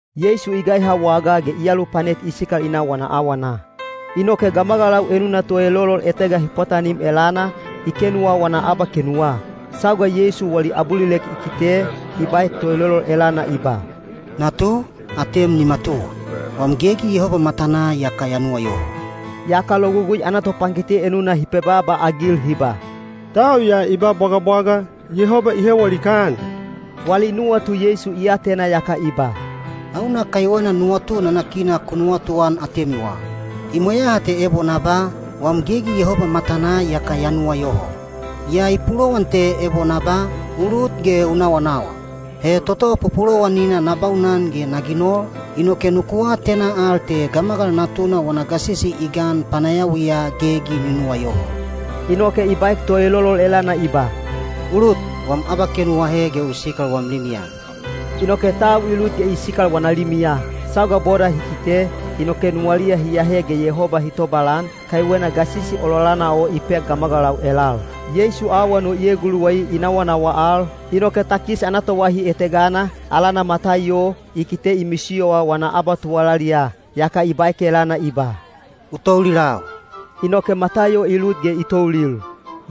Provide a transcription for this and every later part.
Yeisu i gaiha wagaa ge i alupanet i sikal i na wana awana. Inoke gamagalau enuna toelolol etega hi pwatanim elana, i kenuwa wana abakenuwa. Sauga Yeisu wali abulilek i kite, i baek toelolol elana i ba, “Natu, atem ni matuwa! Wam gegi Yehoba matanaa iyaka ya nuwayoho.” Yaka Logugui ana topankite enuna hi pebaaba-agil hi ba, “Tau ya i ba bwagabwaga, Yehoba i hewa likaan.” Wali nuwatu Yeisu i atena yaka i ba, “Hauna kaiwena nuwatu nanakina ku nuwatuan atemiwa? I mweyaha te ebo na ba, ‘Wam gegi Yehoba matanaa iyaka ya nuwayoho.’ Yaa i pulowan te ebo na ba, ‘U lut ge u nawanawa.’ He toto pupulowanina na baunan ge na ginol, inoke nuku atena al te Gamagal Natuna wana gasisi i gan panayawiya gegi ni nuwayoho.” Inoke i baek toelolol elana i ba, “U lut, wam abakenu u ahe ge u sikal wam limiya.” Inoke tau i lut ge i sikal wana limiya. Sauga boda hi kite, inoke nuwaliya hi ahe ge Yehoba hi tobalan, kaiwena gasisi ololana o i pek gamagalau elal. Yeisu awan o i eguluwai i nawanawa al, inoke takis ana toahi etegana, alana Mataiyo, i kite i misiyowa wana abatuwalaliya. Yaka i baek elana i ba, “U toulilau.” Inoke Mataiyo i lut ge i toulil.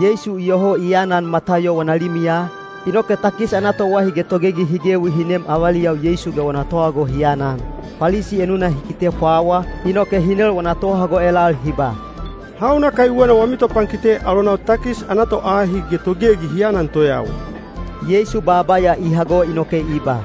Yeisu iyoho i aanan Mataiyo wana limiya, inoke takis ana toahi ge togegi hi gewi hi nem avaliyau Yeisu ge wana tohago hi anan. Palisi enuna hi kite pwawa, inoke hi nel wana tohago elal hi ba, “Hauna kaiwena wami topankite alonau takis ana toahi ge togegi hi anan toyawa?” Yeisu baaba ya i hago inoke i ba,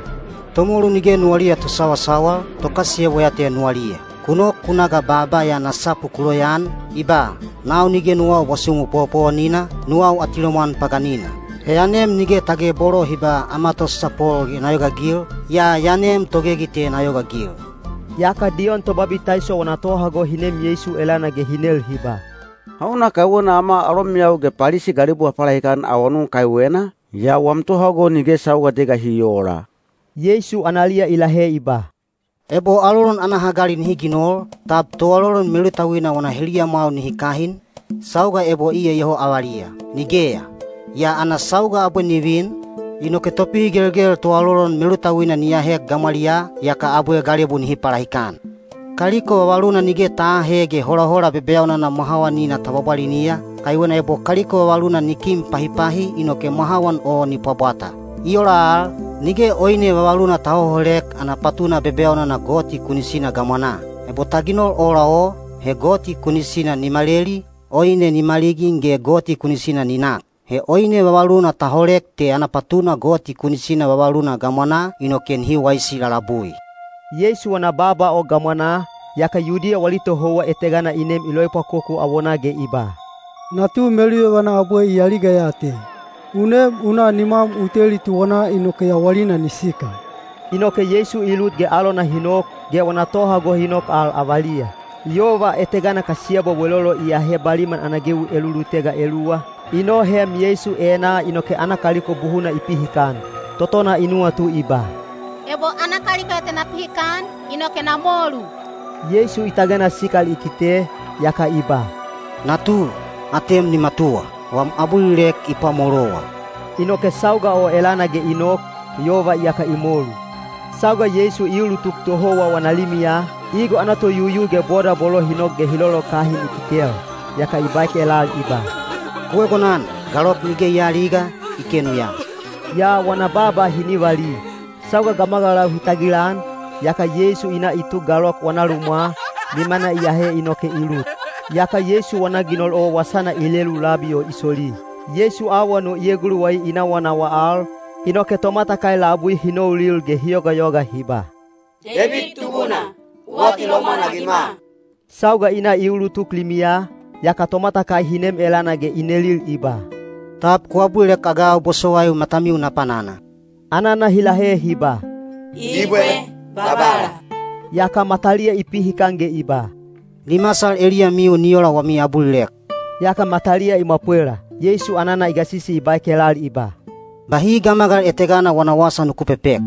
“Tomolu nige nuwaliya tosawasawal, tokasiyebwa ya te nuwaliya. Ku nok ku na ga baaba ya ana sapu ku loyaan, i ba, ‘Nau nige nuwau bwasumu powopowonina, nuwau atilomwan paganina.’ He ya nem nige tage bolo hi ba ‘Ama tosasapol’ ge na yogaagil, yaa ya nem togegi te na yogaagil.” Yaka Diyon Tobabitaiso wana tohago hi nem Yeisu elana ge hi nel hi ba, “Hauna kaiwena ama alomeyau ge Palisi galebu ha palahikan awanun kaiwena, yaa wam tohago nige sauga etega hi oola?” Yeisu analiya i lahe i ba, “Ebo alolon ana hagali nihi ginol, tab toalolon melutauina wana heliyamwau nihi kahin, sauga ebo iya iyoho avaliya? Nigeya! Yaa ana sauga abwe ni vin, inoke topihigelgel toalolon melutauina ni ahek gamwaliyaa, yaka abwe galebu nihi palahikan. “Kaliko vavaluna nige ta aahe ge holahola bebeyaunana mwahawanina ta bwabwaliniya, kaiwena ebo kaliko vavaluna ni kin pahipahi inoke mwahawan o ni pwabwata. I ola al, nige oine vavaluna ta hoholek ana patuna bebeyaunana gamwanaa toto goti kunisina hi ginoliya. Ebo ta ginol ola o, he goti kunisina ni maleli, oine ni maligin ge goti kunisina ni nak. He oine vavaluna ta holek te ana patuna vavaluna gamwanaa toto goti kunisina hi ginoliya, inoke nihi waisi lalabui.” Yeisu wana baaba o gamwanaa, yaka Yudiya wali tohouwa etegana i nem i loepwakoku awonaa ge i ba, “Natu meluyovana abwe i aliga ya te. U nem u na nimwam u teli tuwanaa inoke yawalina ni sikal.” Inoke Yeisu i lut ge alona hi nok, ge wana tohago hi nok al avaliya. Yova etegana kasiyebwa welolo i ahe baliman ana gewi elulutega eluwa, i noheem Yeisu enaa inoke ana kaliko buhuna i pihikan. Totona i nuwatu i ba, “Ebo ana kaliko ya te na pihikan, inoke na molu.” Yeisu i tagena sikal i kite, yaka i ba, “Natu, atem ni matuwa! Wam abulilek i pwamolowa.” Inoke sauga o elana ge i nok, yova iyaka i molu. Sauga Yeisu i ulutuk tohouwa wana limiya, igo ana toyuyu ge boda bolo hi nok ge hi lolokahin i kitel. Yaka i baek elal i ba, “Ku egonan. Galok nige i aaliga, i kenu ya.” Yaa wana baaba hi nivali. Sauga gamagalau hi tagilan, yaka Yeisu i na i tuk galok wana lumwa, nimana i ahe inoke i lut. Yaka Yeisu wana ginol o wasana i lelu labi o i soli. Yeisu awan o i eguluwai i nawanawa al, inoke tomatakai labui hi noulil ge hi yogayoga hi ba, “Deibid Tubuna, u atilomwan-agima.” Sauga i na i ulutuk limiya, yaka tomatakai hi nem elana ge i nelil i ba, “Tab ku abulilek-agau bosowaiu matamiu na panana?” Anana hi lahe hi ba, “Ibwe, Babala.” Yaka mataliya i pihikan ge i ba, “Ni masal eliyamiu ni ola wami abulilek.” Yaka mataliya i mwapwela. Yeisu anana i gasisi i baek elal i ba, “Bahi gamagal etegana wana wasa nuku pepek.”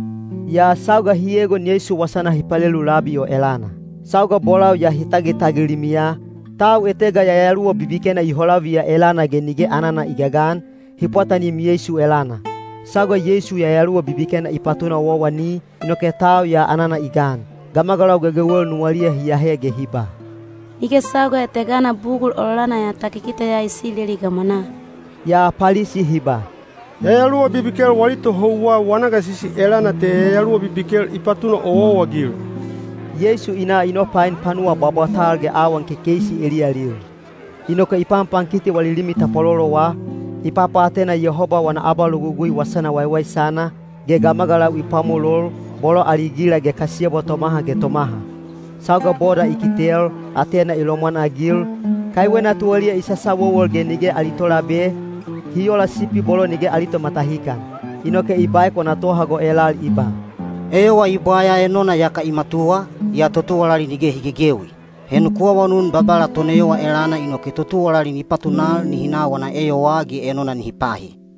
Yaa sauga hi egon Yeisu wasana hi palelu labi o elana. Sauga bolau ya hi tagitagil limiya, tau etega yayaluwa bibikena i holaviya elana ge nige anana i gagan, hi pwatanim Yeisu elana. Sauga Yeisu yayaluwa bibikena i patuna owaowani, inoke tau ya anana i gan. Gamagalau gegewel nuwaliya hi ahe ge hi ba, “Nige sauga etegana bugul ololana ya ta kikiteya Isileli gamwanaa.” Yaa Palisi hi ba, “Yayaluwa bibikel wali tohouwa wana gasisi elana te yayaluwa bibikel i papatuna owaowa-agil.” Yeisu i na i nopain panuwa bwabwatal ge awan kekeisi eliyalil. Inoke i panpankiti wali limi tapwalolowa, i papaatena Yehoba wana abalogugui wasana waiwaisana, ge gamagalau i pwamolol, bolo ali gila ge kasiyebwa tomaha ge tomaha. Sauga boda i kitel, atena i lomwanagil, kaiwena tuwaliya i sasawowol ge nige ali tolabe, hi ola sipi bolo nige ali tomatahikan. Inoke i baek wana tohago elal i ba, “Eyowa i bwaya enona iyaka i matuwa, yaa totuwalali nige hi gegewi. He nuku awanun Babala toneyowa elana inoke totuwalali ni patunal nihi na wana eyowaa ge enona nihi pahi.”